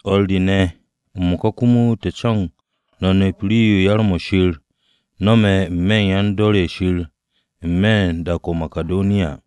O̱r re ne̱, m-mo̱ka komo te̱ co̱no̱g no̱ nep rii-yo yar-mo̱ Shir nome̱ n-me̱ u̱n yan-dor ye̱ Shir n-me̱ u̱n dak-o̱ o-Makidoniya.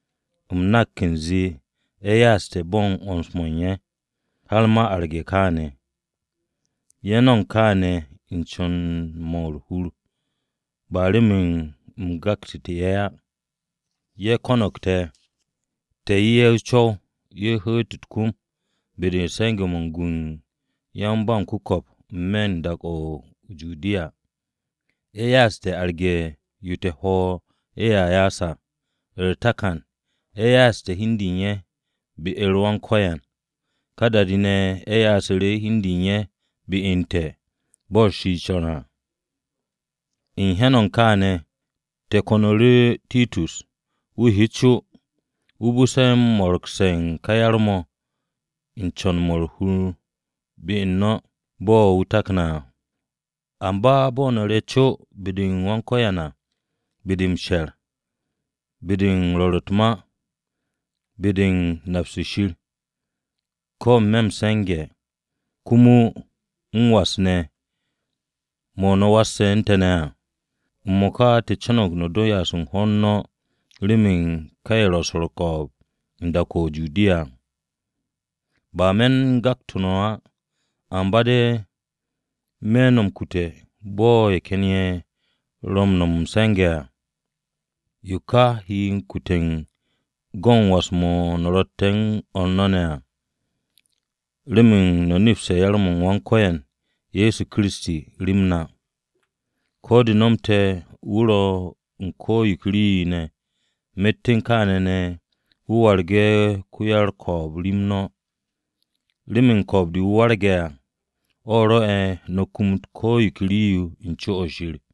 U̱m nak u̱nze ye̱ ya'aste̱ bo̱ u̱n 'wo̱ns-mo̱ u̱n ye̱, har ma arage̱ kaane̱. Ye̱ no̱mo̱g kaane̱ u̱n co̱n-mo̱ u̱r-hur ba remen a u̱n gaktu̱te̱ ye̱ á. Ye̱ ko̱no̱g te̱, te̱ 'ye ye̱ o-co̱w ye̱ hu̱u̱t u̱t-kom be-de u̱n se̱nge̱-mo̱ u̱n gu u̱n yan-ba-m-ku̱ko̱p n-me̱ u̱n dak-o o-Judiya. Ye̱ ya'aste̱ arge̱ yo te̱ hwo̱ ye̱a ya'as à. U̱r-takan, ye̱ ya'aste̱ hi u̱n de u̱n ye̱ be-u̱r Wan-Ko̱yan, ka da-de ne̱ ye̱ ya'asu̱ru̱ hi u̱n de u̱n ye̱ be u̱n te̱, bo̱ Shir co̱ne̱ à. U̱n hyan-o̱ u̱n kaane̱, te̱ ko̱nu̱ru̱ Titus wu̱ he co, wu̱ bu̱se̱ u̱n mo̱ro̱gse̱ u̱n ka yar-mo̱ u̱n co̱n-mo̱ u̱r-hur mo̱ be-u̱r no̱, bo̱ wu̱ takne̱ à. Amba bo̱ no̱ re̱ co be-de u̱n ko̱yan à, be-de m-she̱r, be-de u̱n rwo̱r u̱t-ma, be-de u̱n nap-se Shir, ko̱ n-me̱ m-se̱nge̱, komo m-was ne̱ mo̱ no̱ wasse̱ u̱n te̱ ne̱ à. M-mo̱ka, te̱ co̱no̱g no̱ do m-ya'as u̱n hwo̱r no̱ remen ka ye̱ ro̱ u̱n swo̱ u̱r-ko̱o̱b u̱n dak-o̱ o-Judiya. Ba me̱ u̱n gakte̱ no̱ o̱ á, amba de̱ me̱ no̱ m-kute̱ bo̱ ye̱ ken ye̱ ro̱ m-no̱m m-se̱nge̱ à. Yo ka he m-kute̱ u̱n go̱n was-mo̱ no̱ ro̱tte̱ u̱n o̱r no̱ ne̱ à. Remen no̱ nepse̱ yar-m Wan-Ko̱yan Ye̱so Kiristi rem na. Ko̱ de̱ nomte̱ wu̱ ro̱ u̱n ko̱ yo ke rii-yo ne̱ à, myet u̱n kaane̱ ne̱, wu̱ waragte̱ ko-ko̱o̱b rem no̱. Remen ko-ko̱o̱b-wu̱ wu̱ warge̱ à, o̱ rwo̱'e̱ no̱ kumut ko̱ yo ke rii-yo u̱n co-o̱ Shir.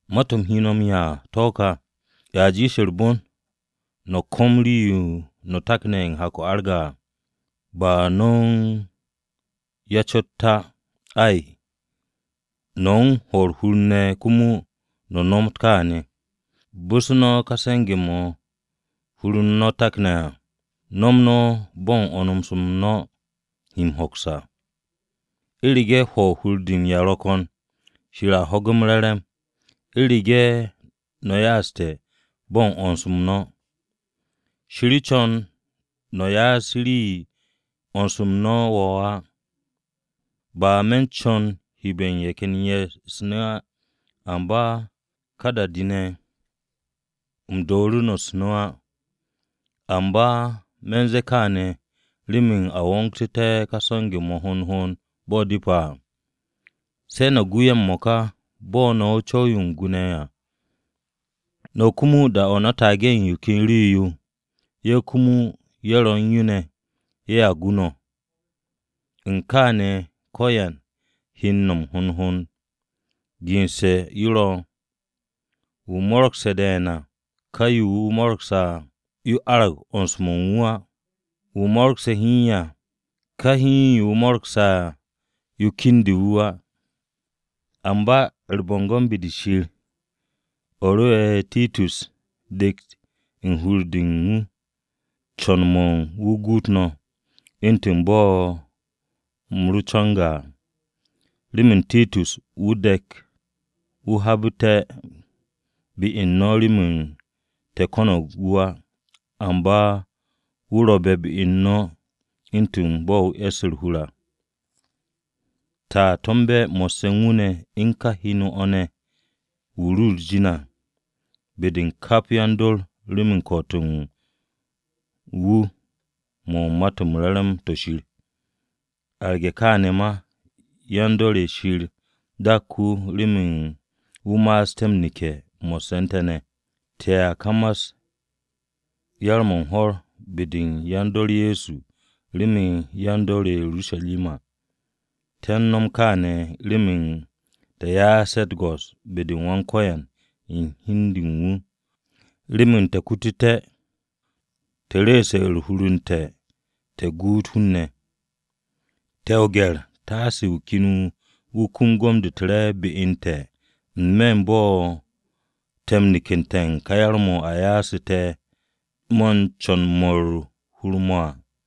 Ma-to̱ u̱m he no̱ m-'ya à to̱ ká: A jiish u̱r-bon no̱ ko̱m rii-yo no̱ takne̱ u̱n hak-o̱ arge̱ à, ba no̱ u̱n ya cot à, ay, no̱ u̱n hwo̱ u̱r-hur komo no̱ nomot kaane̱. Bu̱se̱ no̱ ka se̱nge̱-mo̱ hur-u̱r no̱ takne̱ à, no̱m no̱ bo̱ u̱n 'wo̱ns-m no̱ he m-hoks à. U̱rege̱ hwo̱ u̱r-hur de m-'ya ro̱ ko̱n, Shir a ho̱ge̱ m-re̱re̱m, u̱rege̱ no̱ ya'aste̱ bo̱ u̱n 'wo̱ns-m no̱. Shir co̱n no̱ ya'as rii-yo 'wo̱ns-m no̱ wo̱o̱ á. Ba me̱ u̱n co̱n u̱m hebe̱ ye̱ ken ye̱ u̱s-nu̱ á, ka da-de ne̱ u̱m dooru̱ no̱ u̱s-nu̱ á. Amba me̱ u̱n ze̱e̱ kaane̱ remen a wo̱ngté̱ ka se̱nge̱-mo̱ hond hond bo̱ depe̱ à. Se̱ no̱ gu ye̱ m-mo̱ka bo̱ no̱ u̱n o-co̱w yo u̱n gwu̱ ne̱ à. No̱ komo da-o̱ no̱ taage̱ u̱n yo ken rii-yo, ye̱ komo ye̱ ro̱ u̱n yo ne̱, ye̱a gu no̱. U̱n kaane̱ ko̱yan he m-nom hond hond. Gense̱ yo ro̱: “Wu̱ mo̱ro̱gse̱ de̱e̱n à, ka yo wu̱ mo̱ro̱gse̱ à, yo arag 'wo̱ns-mo̱ u̱n wu̱ á. Wu̱ mo̱ro̱gse̱ hiin à, ka hiin yo wu̱ mo̱ro̱gse̱ à, yo kendu̱ wu̱ á.” Amba u̱r-bo̱ngo̱n be-de Shir, o̱ rwo̱'e̱ Titus dekt u̱n hur-de u̱n wu̱, co̱n-mo̱ u̱n wu̱ guut no̱, u̱ntu̱n bo̱ u̱m ro co̱nge̱ à. Remen Titus wu̱ u̱n de̱k wu̱ habu̱te̱ be u̱n no̱ remen te̱ ko̱no̱g wu̱ á, amba wu̱ ro̱be̱ be-u̱r no̱ u̱ntu̱n bo̱ wu̱ e̱sse̱ u̱r-hur à. Te̱a to̱mbe̱ mo̱sse̱ u̱n wu̱ ne̱, u̱n ka heno-o̱ ne̱ wu̱ ru u̱r-jin à, be-de u̱n kap yan-dor remen ko̱'o̱t-mo̱ u̱n wu̱ mo̱ u̱n Ma-to̱ m-Re̱re̱m to̱ Shir. Arge̱ kaane̱ ma, yan-dor ye̱ Shir dak wu̱ remen wu̱ ma'asté̱ m-neke̱ mo̱sse̱ u̱n te̱ ne̱. Te̱a kamas yar-mo̱ u̱n hwo̱r be-de u̱n yan-dor Ye̱so remen yan-dor ye̱ o-Urusharima. Te̱ u̱n no̱m kaane̱ remen te̱ ya'asté̱ u̱t-go̱s be-de u̱n Wan-Ko̱yan u̱n hi u̱n de u̱n wu̱ komo remen te̱ kututé̱ u̱nze te̱ ru̱'u̱ste̱ u̱r-hur te̱ guut hun-ne̱. Te̱ o-gye̱r taase wu̱ ken wu̱ kum gom-de u̱r-re̱e̱b be u̱n te̱ n-me̱ u̱n bo̱ te̱ m-nekette̱ u̱n ka yar-mo̱ a ya'asu̱ te̱ mo̱ u̱n co̱n-mo̱ u̱r-hur à.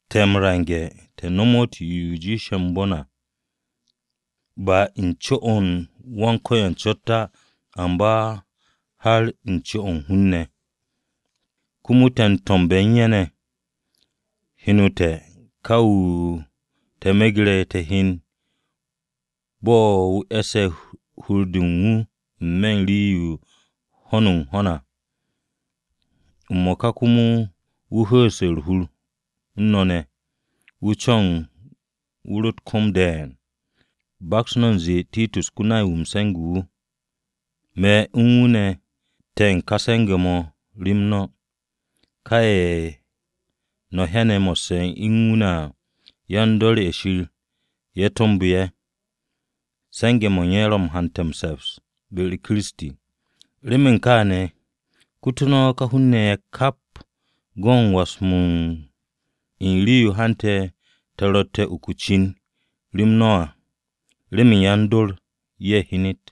Co̱n-m te̱ te̱ nomot yo jiishe̱ m-bon à, ba u̱n co-o u̱n Wan-Ko̱yan cot á, amba har u̱n co-o̱ u̱n hun-ne̱. Komo te̱ m-to̱mbe̱ u̱n ye̱ ne̱, heno te̱ ka wu̱ te̱ megre̱ te̱ hyen bo̱ wu̱ e̱sse̱ u̱n hur-de u̱n wu̱ n-me̱ u̱n rii u̱n ho̱n u̱n ho̱n à. M-mo̱ka komo wu̱ ho'oste̱ u̱r-hur u̱n no̱ ne̱, wu̱ co̱no̱g wu̱ ru̱ u̱t-kom de̱e̱n. Baks no̱ u̱nze Titus, ko-nay-wu̱ m-se̱nge̱ wu̱, me̱ u̱n wu̱ ne̱ te̱ u̱n ka se̱nge̱-mo̱ rem no̱. Ka ye̱ no̱ hyane̱ mo̱sse̱ u̱n wu̱ ne̱ à, yan-dor ye̱ Shir ye̱ to̱mbu̱ ye̱, se̱nge̱-mo̱ u̱n ye̱ ro̱ m-hante̱ m-se̱ps be-u̱r Kiristi. Remen kaane̱ kutu̱ no̱ ka hun-ne̱ ye̱ kap go̱n was-m no̱ u̱n rii-yo hante̱ te̱ ro̱tte̱ u̱n uku o-cin rem no̱ à, remen yan-dor ye̱ hyenet.